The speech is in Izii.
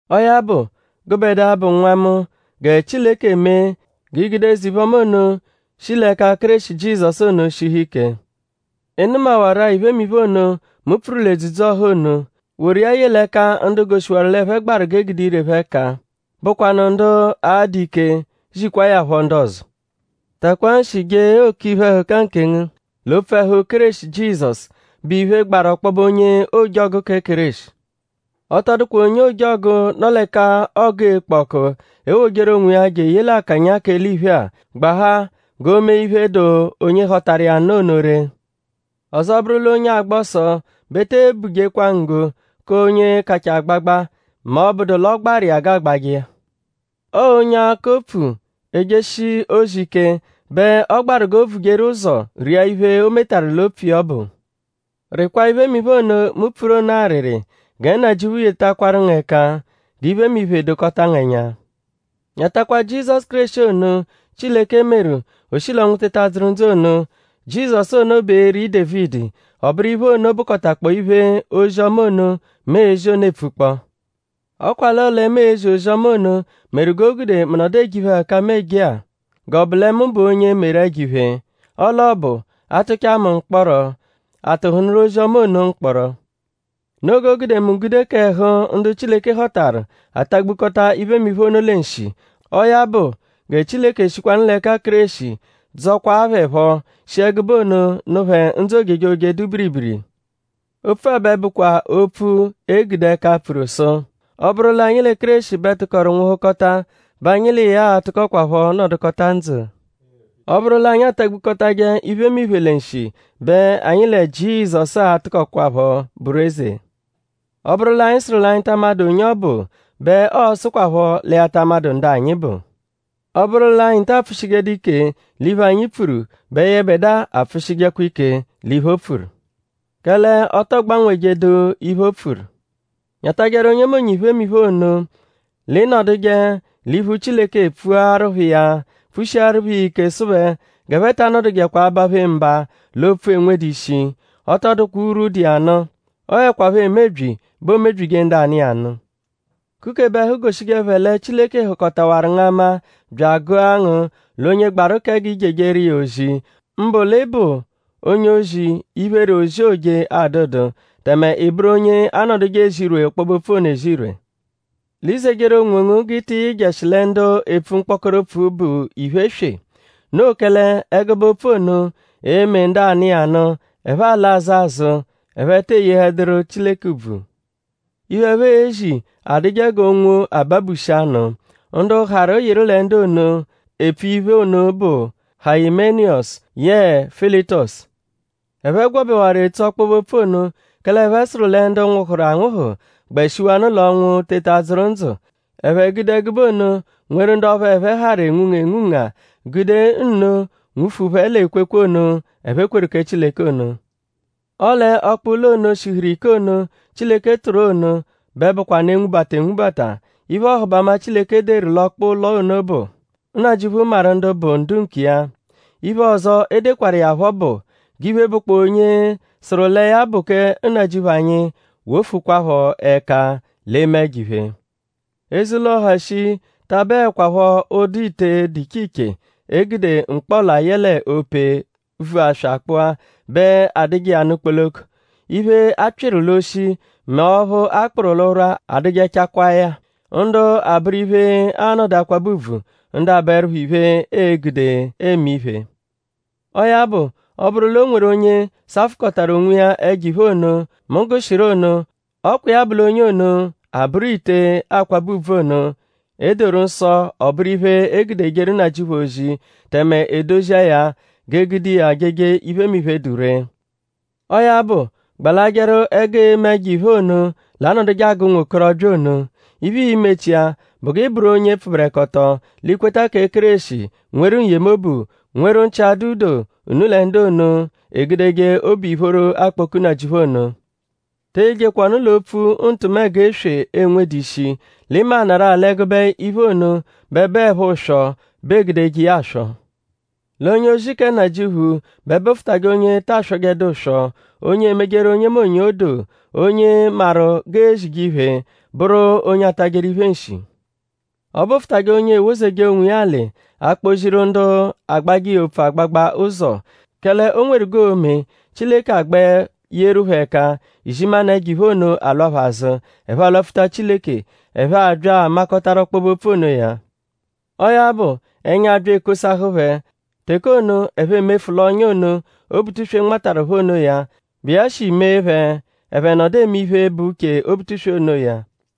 Ọo ya bụ; gụbedua, bụ nwa mu; gẹ Chileke mee g'i gude eze-iphe-ọma ono, shi l'ẹka Kéreshi Jizọsu ono shihu ike. Ị nụmawaru-a iphemiphe ono, mu pfuru l'edzudzu-ọha ono. Woru iya ye l'ẹka ndu goshiwaru l'ẹphe gbaru g'e gude ire phẹ ẹka bụkwanu ndu a-dụ ike zikwaa ya phọ ndu ọzo. Takwaa nshi jee òkè iphe-ẹhuka nkengu l'opfu ẹhu Kéreshi Jizọsu, bụ iphe, gbaru ọkpobe onye ojọgu kẹ Kéreshi. Ọ tọ dụkwa onye ojọgu, nọ l'ẹka ọgu ekpo ọku, ewojeru onwiya je eye l'akanya k'eliphe-a; gbahaa g'o mee iphe, dụ onye họtaru iya nụ ono ree. Ọzo bụru l'onye agba ọso bẹ e te bujekwa nggo k'onye kachaa agbagba mẹ ọ -bụdu l'ọ gbaru iya g'aagbajẹ iya. Ọo onye akọ opfu, ejeshi ozi ike bẹ ọ gbaru kẹ g'o vujeru ụzo ria iphe, o metaru l'opfu iya ọbu. Rịkwaa iphemiphe ono, mu pfuru ono arịri. Gẹ Nnajịuphu yetakwaru ngu ẹka g'iphemiphe dokọta ngu ẹnya. Nyatakwa Jizọsu Kéreshi ono, Chileke meru: o shi l'ọnwu teta dzụru ndzụ ono. Jizọsu ono bụ eri Dévidi; ọ bụru iphe ono bụkotakpoo iphe ozi-ọma ono, mu ezi ono epfukpọ. Ọ kwa l'ọo lẹ mu ezi ozi-ọma ono meru g'o gude mu nọdu eje iphe-ẹhuka-a, mu eje-a; g'ọ bụ lẹ mu bụ onye meru ẹjo-iphe. Ọle ọ bụ; a -tụchaa mu mkpọro;?a tụhunuru ozi-ọma ono mkpọro? Noo g'o gude mu gude k'ẹhu ndu Chileke họtaru atagbukọta iphemiphe ono lẹ nshi; ọo ya bụ gẹ Chileke eshikwanụ l'ẹka Kéreshi dzọkwaa phẹ phọ; shi ẹgube ono nụ phẹ ndzụ ojejoje, dụ biribiri. Opfu-a bẹ bụkwa opfu, e gude ẹka, pfuru sụ: Ọ -bụru l'anyi lẹ Kéreshi bẹ tụkoru nwụhukota bẹ anyi l'iya a-tụkokwapho nọdukota ndzụ. Ọ -bụru l'anyi atagbukọtaje iphemiphe lẹ nshi bẹ anyi lẹ Jizọsu a-tụkokwapho bụru eze. Ọ -bụru l'anyi sụru l'anyi ta amadụ onye ọ bụ bẹ ọo-sụkwapho lẹ ya ta amadụ ndu anyi bụ. Ọ -bụru l'anyi ta apfụshijedu ike l'iphe, anyi pfuru bẹ yẹbedua apfụshijekwa ike l'iphe, o pfuru. Kẹle ọ tọ gbanwejedu iphe, o pfuru. Nyatajẹru onyemonye iphemiphe ono; l'ị nọduje l'iphu Chileke pfuaru phẹ iya pfushiaru phẹ iya ike sụ phẹ g'ẹphe ta nọdujekwa abaphe mba l'opfu, enwedu ishi. Ọ tọ dụkwa urwu dụ iya nụ. Ọ 'ẹkwapho emebyi bẹ oomebyije ndu anụ iya nụ. Kukebe ẹhu goshije phẹ lẹ Chileke hụkotawaru ngu ama bya agụa ngu l'onye gbaru kẹ g'i jejeru iya ozi; mbụ l'ị bụ onye-ozi, iphere ozi, ooje adụdu; tẹme ị bụru onye anọduje ezirwe ọkpobe-opfu ono ezirwe. L'i zejeru onwongu g'ị tị yịjeshi lẹ ndu epfu mkpọkoro opfu, bụ iphe eswe. Noo kẹle ẹgube opfu ono e-me ndu anụ iya nụ: ẹphe alaa azụ azụ; ẹphe te eyehẹduru Chileke ùbvù. Iphe, ẹphe ezi adụje g'onwo, ababushi anụ. Ndu harụ yịru lẹ ndu ono, epfu iphe ono bụ Hayimeniyọsu yẹe Filitosu. Ẹphe gwọbewaru etso ọkpobe-opfu ono; kẹle ẹphe sụru lẹ ndu nwụhuru anwụhu gbẹ shiwanụ l'ọnwu teta dzụru ndzụ. Ẹphe gude ẹgube ono nweru ndu ọphu ẹphe harụ enwunga enwunga; gude nno nwufu phẹ l'ekwekwe ono, ẹphe kweru kẹ Chileke ono. Ọle ọkpa-ụlo ono, shihuru ike ono, Chileke tụru ono bẹ bụkwanu 'enwubata enwubata. Iphe-ọhubama, Chileke deru l'ọkpa-ụlo ono bụ: Nnajịuphu maru ndu bụ ndu nkiya. Iphe ọzo, o dekwaru iya phọ bụ: G'iphe, bụkpoo onye sụru lẹ ya bụ kẹ Nnajịuphu anyi; wofukwaphọ ẹka l'eme ẹjo-iphe. “Eze-ụlo, ha shii ta abụekwapho ụdu ite, dụ iche iche, e gude mkpọla yẹle ope, vu aswa kpụa bẹ adụje iya nụ kpoloko. Iphe, a pyịru l'oshi mẹ ọphu a kpụru l'ụrwa adụjechakwaa ya. Ndu abụru iphe, aanọdu akwabẹ ùbvù; ndu abụerupho iphe, e gude eme iphe. Ọo ya bụ; ọ -bụru l'o nweru onye safụkotaru onwiya ẹjo-iphe ono, mu gụshiru ono; ọ kwa iya bụ l'onye ono a-bụru ite, aakwabẹ ùbvù ono, e doru nsọ ọ bụru iphe, e gude ejeru Nnajịuphu ozi; tẹme edozia ya g'e gude iya jeje iphemiphe, dụ ree. Ọo ya bụ; gbalajẹru ẹgu eme ẹjo-iphe ono, l'anọduje agụ ụnwokorobya ono. Iphe, ii-mechia bụ g'i bụru onye pfụberekoto; l'i kweta kẹ Kéreshi; nweru n-yemobu; nweru nchị-adụ-doo unu lẹ ndu ono, egudeje obu-ìphóró akpọku Nnajịuphu ono. Te eyejekwa ọnu l'opfu ntụmego eswe, enwedu ishi; l'ị maanarụ-a l'ẹgube iphe ono bẹ bụepho ụswo bẹ e gudeje iya aswọ. L'onye-ozi kẹ Nnajịuphu bẹ bụfutajekwa onye ta aswọjedu ụswo; onye emejeru onyemonye odoo; onye maru g'ezije iphe; bụru onye atajẹru iphe nshi. Ọ bụfutaje onye ewozeje onwiya alị; akpọ-ziru ndu agbajẹ iya opfu agbagba ụzo. Kẹle o nweru g'oo-me Chileke agbẹ yeru phẹ ẹka; izimanụ ẹjo-iphe ono alwa phẹ azụ; ẹphe alwapfuta Chileke; ẹphe abya amakọtaru ọkpobe-opfu onoya. Ọo ya bụ; ẹnya abya ekosahụ phẹ teke ono; ẹphe emefu l'ọ́nyà ono, Obutuswe nmataru phẹ onoya, bụ iya shi mee phẹ: ẹphe nọdu eme iphe, bụ uche Obutuswe onoya.”